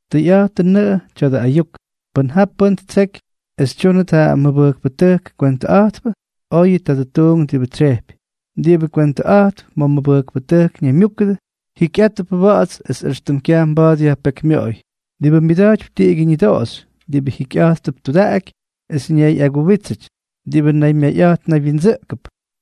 Tʉyꞌa̱jtʉnʉꞌʉ tya̱dʉ ayuk: Pʉn ja pʉ́n ttseky es tyúnʉt ja mʉbʉjkpʉtʉjk kwentʉꞌa̱jtpʉ, oyʉ tadʉ tuunk diꞌibʉ tsyejpy. Diꞌibʉ kwentʉꞌa̱jtp ma̱ mʉbʉjkpʉtʉjk ñaymyúkʉdʉ, jikyꞌátʉp wa̱ꞌa̱ts es éxtʉm kyaj mba̱a̱t yajpekymyoꞌoy, diꞌibʉ myʉda̱jtypy tiꞌigyʉ ñʉdoꞌoxy, diꞌibʉ jikyꞌa̱jtp tudaꞌaky es ñayꞌaguwítsʉty, diꞌibʉ naymyayꞌa̱jt naywyindsʉꞌkʉp,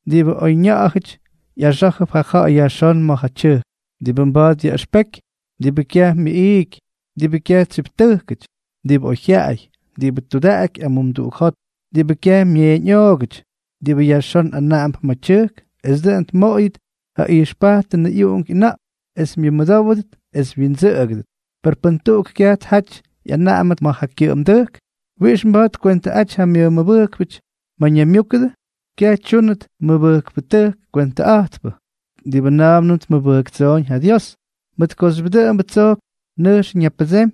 diꞌibʉ oyña̱ꞌa̱jʉty ꞌyaxá̱jʉp ja ja̱ꞌa̱y yajxón ma̱ ja tyʉjk, diꞌibʉ mba̱a̱t yaꞌʉxpeky, diꞌibʉ kyaj myʉꞌiiky, diꞌibʉ kyaj tsyiptʉjkʉty, diꞌibʉ oyjyaꞌay, diꞌibʉ tudaꞌaky amumduꞌuk jot, diꞌibʉ kyaj myeeñꞌoogʉty, diꞌibʉ yajxón anaꞌamp ma̱ tyʉjk es dʉꞌʉn tmoꞌoyʉt ja ijxpajtʉnʉ ꞌyuꞌunk ꞌyʉna̱ꞌk es myʉmʉdówʉdʉt es wyindsʉꞌʉgʉdʉt; pes pʉn tuꞌuk kyaj tjaty ꞌyanaꞌamʉt ma̱ yʉ kyʉꞌʉmdʉjk, ¿wiꞌix mba̱a̱t tkwentʉꞌaty ja myʉmʉbʉjkpʉty ma̱ ñaymyúkʉdʉ? Kyaj tyúnʉt mʉbʉjkpʉtʉjk kwentʉꞌa̱jtpʉ diꞌibʉ na̱a̱mnʉm tmʉmʉbʉjktsooñ ja Dios, mʉt kooxyʉp dʉꞌʉmbʉ tsojk nʉjx ñapʉdsemy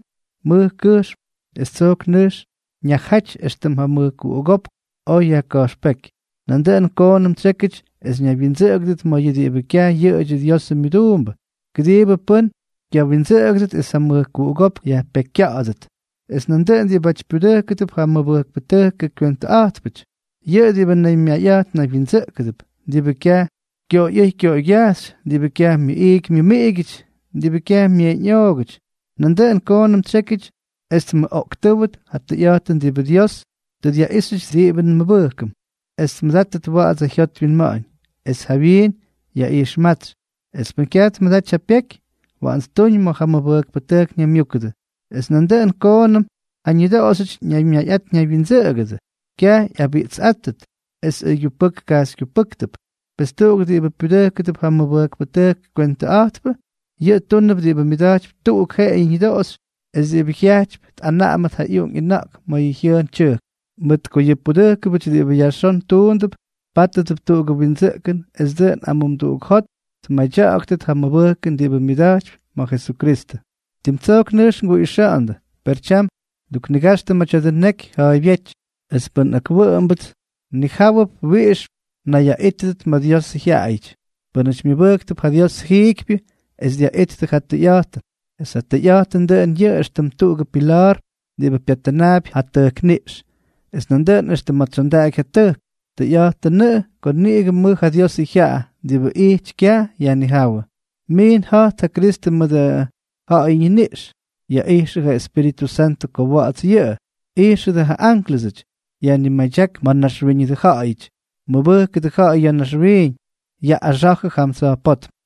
mʉj kʉjxm es tsojk nʉjx ñajaty éxtʉm ja mʉjkuꞌugópk oj yajka̱jxpéky. Nandʉꞌʉn koonʉm tsyékyʉty es ñaywyindsʉꞌʉgʉdʉt ma̱ yʉ diꞌibʉ kyaj yʉꞌʉdyʉ Diosʉ myʉduumbʉ, kʉdiibʉ pʉ́n kyawindsʉꞌʉgʉdʉt es ja mʉjkuꞌugópk yajpekykya̱ꞌa̱dʉt. Es nandʉꞌʉn diꞌibáty pyudʉjkʉdʉp ja mʉbʉjkpʉtʉjkʉ kywentʉꞌa̱jtpʉty, yʉꞌʉ diꞌibʉ naymyayꞌa̱jt naywyindsʉꞌkʉp, diꞌibʉ kyaj kyoꞌoyꞌʉ́y kyoꞌoygyajxy, diꞌibʉ kyaj myʉꞌiiky myʉmiꞌigyʉty, diꞌibʉ kyaj myeeñꞌoogʉty. Nandʉꞌʉn koonʉm tsyékyʉty es tmʉꞌoꞌktʉ́wʉt ja tʉyꞌa̱jtʉn diꞌibʉ Dios tʉ dyaꞌíxyʉty diꞌibʉ nmʉbʉjkʉm, es myʉdátʉt wa̱ꞌa̱ts ja jyot wyinma̱ꞌa̱ñ, es jawyiin yaꞌijxmátsy; es pʉn kyaj tmʉdaty ja pyeky, waꞌan ttuñ ma̱ ja mʉbʉjkpʉtʉjk ñaymyúkʉdʉ. Es nandʉꞌʉn koonʉm ja ñʉdoꞌoxyʉty ñaymyayꞌát ñaywyindsʉꞌʉgʉdʉ, kyaj ꞌyabiꞌtsꞌáttʉt, es ʉygyupʉk kyajxykyupʉ́ktʉt. Pes tuꞌuk diꞌibʉ pyudʉjkʉp ja mʉbʉjkpʉtʉjkʉ kywentʉꞌa̱jtpʉ, yʉꞌʉ túnʉp diꞌibʉ myʉda̱jtypy tuꞌuk jeꞌeyʉ ñʉdoꞌoxy es diꞌibʉ jyajtypy tꞌanaꞌamʉt ja ꞌyuꞌunk ꞌyʉna̱ꞌk ma̱ yʉ jyʉʉn tyʉjk. Mʉt ko yʉ pudʉjkʉbʉty diꞌibʉ yajxón tuundʉp, pátʉdʉp tuꞌugʉ windsʉꞌkʉn es dʉꞌʉn amumduꞌuk jot tmadya̱ꞌa̱ktʉt ja mʉbʉjkʉn diꞌibʉ myʉda̱jtypy ma̱ Jesukristʉ. Tim tsojk nʉjx nguꞌixa̱ꞌa̱ndʉ, per tyam nduknigaxtʉ ma̱ tya̱dʉ neky ja̱a̱ybyéty, es pʉn akwʉꞌʉmʉpts, mnijáwʉp wiꞌix mnayyaꞌítyʉty ma̱ Diosʉ jyaꞌayʉty, pʉ́nʉty myʉbʉjktʉp ja Diosʉ jiikypyʉ es dyaꞌittʉ ja tʉyꞌa̱jtʉn. Es ja tʉyꞌa̱jtʉn, dʉꞌʉn yʉꞌʉ éxtʉm tuꞌugʉ pila̱a̱r diꞌibʉ pyattʉnaapy ja tʉjkniꞌx, es nandʉꞌʉn éxtʉm ma̱ tsondaꞌaky ja tʉjk. Tʉyꞌa̱jtʉnʉꞌʉ ko niꞌigʉ mʉj ja Diosʉ jyaꞌa diꞌibʉ ijty kyaj yajnijáwʉ: Miin ja̱jt ja Kristʉ mʉdʉ ja̱ꞌa̱yʉ ñiniꞌx, yaꞌijxʉ ja Espíritʉ Santʉ ko wa̱ꞌa̱ts yʉꞌʉ, ijxʉdʉ ja ánklʉsʉty, yajnimaydyák ma̱ naxwíñʉdʉ ja̱ꞌa̱yʉty, mʉbʉjkʉdʉ ja̱ꞌa̱y ya̱ naxwiiñ, yaꞌꞌaxa̱jʉ jam tsa̱jpótm.